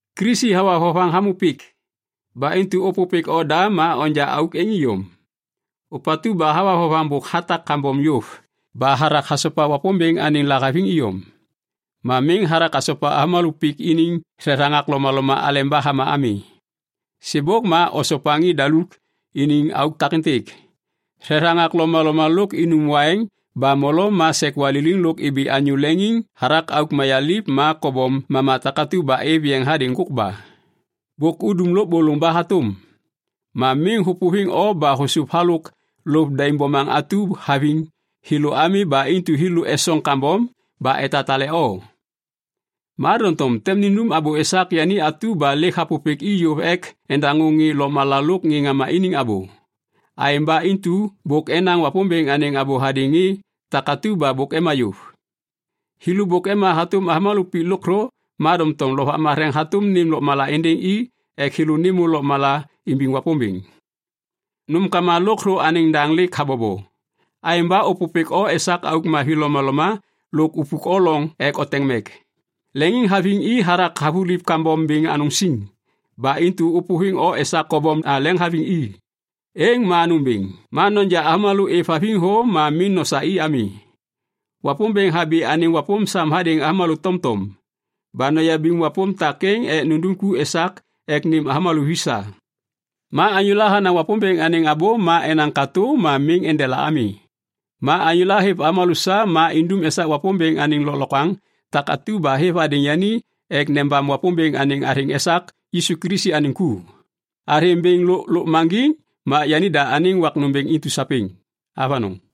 Kilisi hawa vovaŋ hamô pik. Ba intu ôpôpêk oda ma onja auk êŋ iyom. Ôpatu ba hawa vovaŋ bôk hatak kambom yôv ba hathak hasopa Wapômbêŋ anêŋ lahaviŋ iyom. Ma miŋ hathak hasopa avômalô pik iniŋ thethaŋak lomaloma aleba hama ami. Sêbôk ma osopa ŋê daluk iniŋ auk takêntêk, thethaŋak lomaloma lôk inum waiŋ ba molo ma sek waliliŋ lôk ibi anyô leŋiŋ hathak auk mayaliv ma kobom mama takatu ba êv yeŋ hadêŋ ŋgôkba. Bôk udum lôbôlôŋ ba hatôm. Ma miŋ hôpôviŋ o ba hôsôv halôk lôv daim bomaŋ atu haviŋ thêlô ami ba intu thêlô esoŋ kambom ba etatale o. Ma doŋtom tem nindum abô esak yani atu ba lêk hapôpêk i yôv ek endaŋô ŋê lôkmala lôk ŋê ŋama iniŋ abô. Aêŋ ba intu bôk enaŋ Wapômbêŋ anêŋ abô hadêŋ ŋê takatu ba bôk ema yôv. Thêlô bôk ema hatôm avômalô pik lôkthô ma doŋtom Lovak Matheŋ hatôm nêm lôkmala êndêŋ i ek thêlô nêmô lôkmala imbiŋ Wapômbêŋ. Nômkama lôkthô anêŋ daŋ lêk habobo. Aêŋ ba ôpôpêk o esak auk mavi lomaloma lôk upuk o loŋ ek oteŋ mek. Leŋiŋhaviŋ i hathak havuliv kambom bêŋ anôŋ siŋ. Ba intu ôpôviŋ o esak kobom leŋhaviŋ i. Êŋ ma nômbêŋ. Ma noja avômalô êvhaviŋ thô ma miŋ nosa i ami. Wapômbêŋ habi anêŋ wapôm sam hadêŋ avômalô tomtom. Ba noyabiŋ wapôm takêŋ ek nundum ku esak ek nêm avômalô vi sa. Ma anyôla hanaŋ Wapômbêŋ anêŋ abô ma enaŋ katô ma miŋ endela ami. Ma anyôla hêv avômalô sa ma indum esak Wapômbêŋ anêŋ lôklokwaŋ takatu ba hêv hadêŋ yani ek nebam Wapômbêŋ anêŋ athêŋ esak Yisu Kilisi anêŋ ku. Athêŋ bêŋ lôk lôkmaŋgiŋ ma yanida anêŋ wak nômbêŋ intu sapêŋ. Avanôŋ.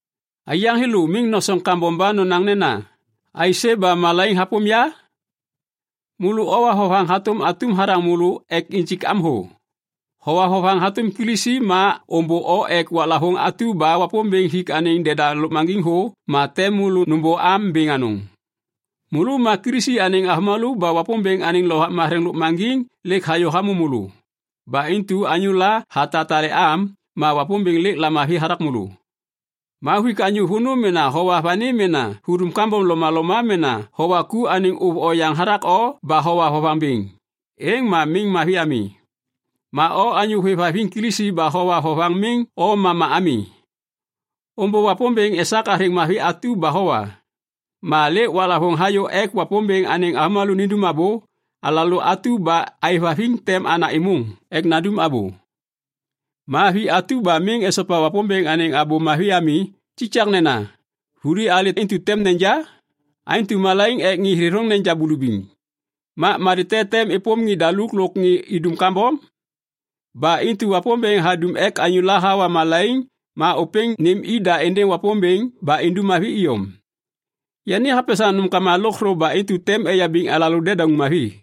Aiyaŋ thêlô miŋ nosoŋ kambom ba nonaŋ nena, “Aisê ba malaiŋ hapôm ya?” Môlô owa vovaŋ hatôm atum hathaŋ môlô ek injik am thô. Howa vovaŋ hatôm Kilisi ma ômbô o ek waklavôŋ atu ba Wapômbêŋ hik anêŋ deda lôkmaŋgiŋ thô ma tem môlô nômbô am bêŋ anôŋ. Môlô ma Kilisi anêŋ avômalô ba Wapômbêŋ anêŋ Lovak Matheŋ lôkmaŋgiŋ lêk hayô hamô môlô. Ba intu anyôla hatatale am, ma Wapômbêŋ lêk lamavi hathak môlô. Ma huik anyô vônô mena howa vani mena hudum kambom lomaloma mena howa ku anêŋ ôv oyaŋ hathak o ba howa vovaŋ bêŋ, êŋ ma miŋ mavi ami. Ma o anyô hôêvhaviŋ Kilisi ba howa vovaŋ miŋ o mama ami. Ômbô Wapômbêŋ esak athêŋ mavi atu ba howa. Ma lêk waklavôŋ hayô ek Wapômbêŋ anêŋ avômalô nindum abô. Alalô atu ba aêvhaviŋ tem ana êmôŋ ek nandum abô. Ma vi atu ba miŋ esopa Wapômbêŋ anêŋ Abô Mavi ami, kikaknena. Vuli alê intu tem neja? “Aêntu malaiŋ ek ŋê thêthôŋ neja bulubiŋ, ma malê te tem êpôm ŋê daluk lôk ŋê idum kambom?” Ba intu Wapômbêŋ hadum ek anyôla hawa malaiŋ ma ôpêŋ nêm ida êndêŋ Wapômbêŋ ba indum mavi iyom. Yani hapesaŋ nômkama lôkthô ba intu tem eyabiŋ alalô dedauŋ mavi.